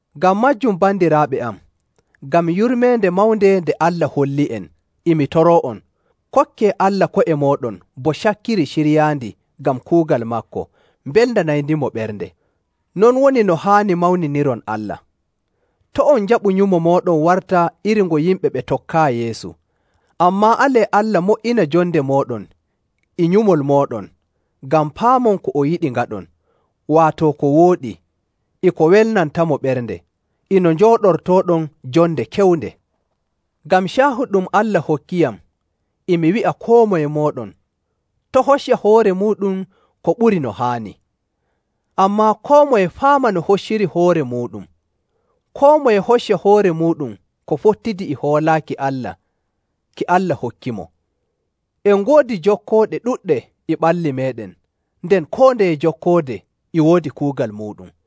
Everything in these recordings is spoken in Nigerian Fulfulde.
Ngam maajum bandiraaɓe am, ngam yurmeende mawnde nde Allah holli'en, e mi toroo'on, kokkee Allah ko'e mooɗon bo cakkiri ciryaandi ngam kuugal maako, mbelnanayndimo ɓernde. Non woni no haani mawniniron Allah. To' on njaɓu nyumo mooɗon warta iri ngo yimɓe ɓe tokkaayi Yeesu, ammaa alee Allah mo''ina jonde mooɗon e nyumol mooɗon, ngam paamon ko o yiɗi ngaɗon, waato ko wooɗi, e ko welnantamo ɓernde, e no njooɗortooɗon jonde kewnde. Ngam caahu ɗum Allah hokkiyam, e mi wi'a koo moye mooɗon, to' hocca hoore muuɗum ko ɓuri no haani. Ammaa koo moye faama no hocciri hoore muuɗum. Koo moye hocca hoore muuɗum ko fottidi e hoolaaki Allah ki Allah hokkimo. En ngoodi jokkooɗe ɗuɗɗe e ɓalli meeɗen, nden koo ndeye jokkoode e woodi kuugal muuɗum.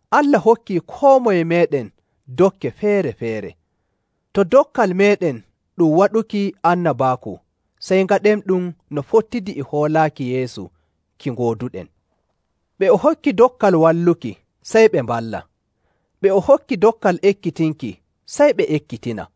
Allah hokkii koo moye meeɗen dokke feere‑feere. To dokkal meeɗen ɗum waɗuki annabaaku, sey ngaɗenɗum no fottidi e hoolaaki Yeesu ki ngooduɗen. Ɓe o hokki dokkal walluki, sey ɓe mballa. Ɓe o hokki dokkal ekkitinki, sey ɓe ekkitina.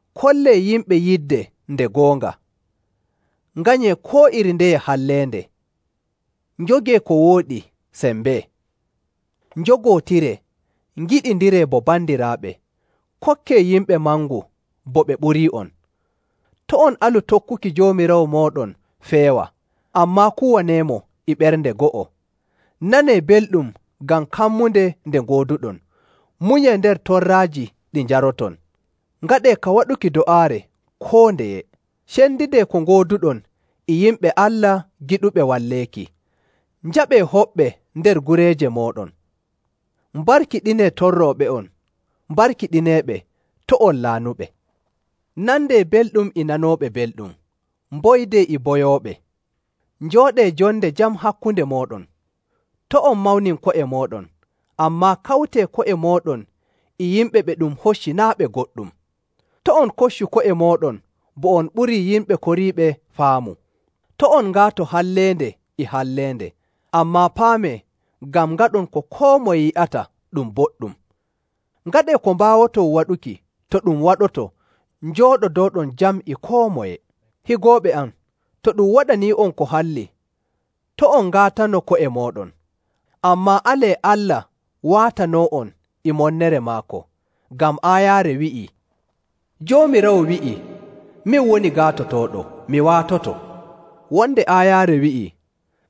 Kollee yimɓe yidde nde goonga. Nganyee koo iri ndeye halleende, njogee ko wooɗi sembee. Njogootiree, ngiɗindiree bo bandiraaɓe, kokkee yimɓe mangu bo ɓe ɓurii'on. To' on alu tokkuki Joomiraawo mooɗon feewa, ammaa kuwaneemo e ɓernde go'o. Nanee belɗum ngam kammunde nde gooduɗon, munyee nder torraaji ɗi njaroton, ngaɗee ka waɗuki do'aare koo ndeye. Cendidee ko ngooduɗon e yimɓe Allah giɗuɓe walleeki, njaɓɓee hoɓɓe nder gureeje mooɗon. Mbarkiɗinee torrooɓe'on, mbarkiɗineeɓe, to' on laanuɓe.. Nandee belɗum e nanooɓe belɗum, mboydee e boyooɓe. Njooɗee jonde jam hakkunde mooɗon. To' on mawnin ko'e mooɗon, ammaa kawtee ko'e mooɗon e yimɓe ɓe ɗum hocci naa' ɓe goɗɗum. To' on koccu ko'e mooɗon bo on ɓurii yimɓe koriiɓe faamu.. To' on ngaato halleende e halleende, ammaa paamee ngam ngaɗon ko koo moye yi'ata ɗum boɗɗum. Ngaɗee ko mbaawoton waɗuki to ɗum waɗoto njooɗodooɗon jam e koo moye. Higooɓe am, to ɗum waɗanii'on ko halli, to' on ngaatano ko'e mooɗon, ammaa alee Allah waatanoo'on e monnere maako. Ngam aayaare wi'ii, “Joomiraawo wi'i, ‘Min woni gaatotooɗo, mi waatoto.’”. Wonde aayaare wi'ii,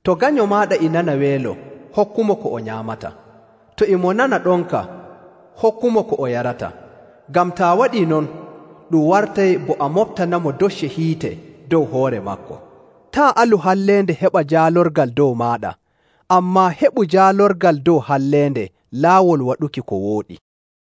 “To ganyo maaɗa e nana weelo, hokkumo ko o nyaamata; to e mo nana ɗonka, hokkumo ko o yarata; ngam taa waɗii non, ɗum wartay bo a moɓtanamo docce hiite dow hoore maako.”. Taa' alu halleende heɓa jaalorgal dow maaɗa, ammaa heɓu jaalorgal dow halleende laawol waɗuki ko wooɗi.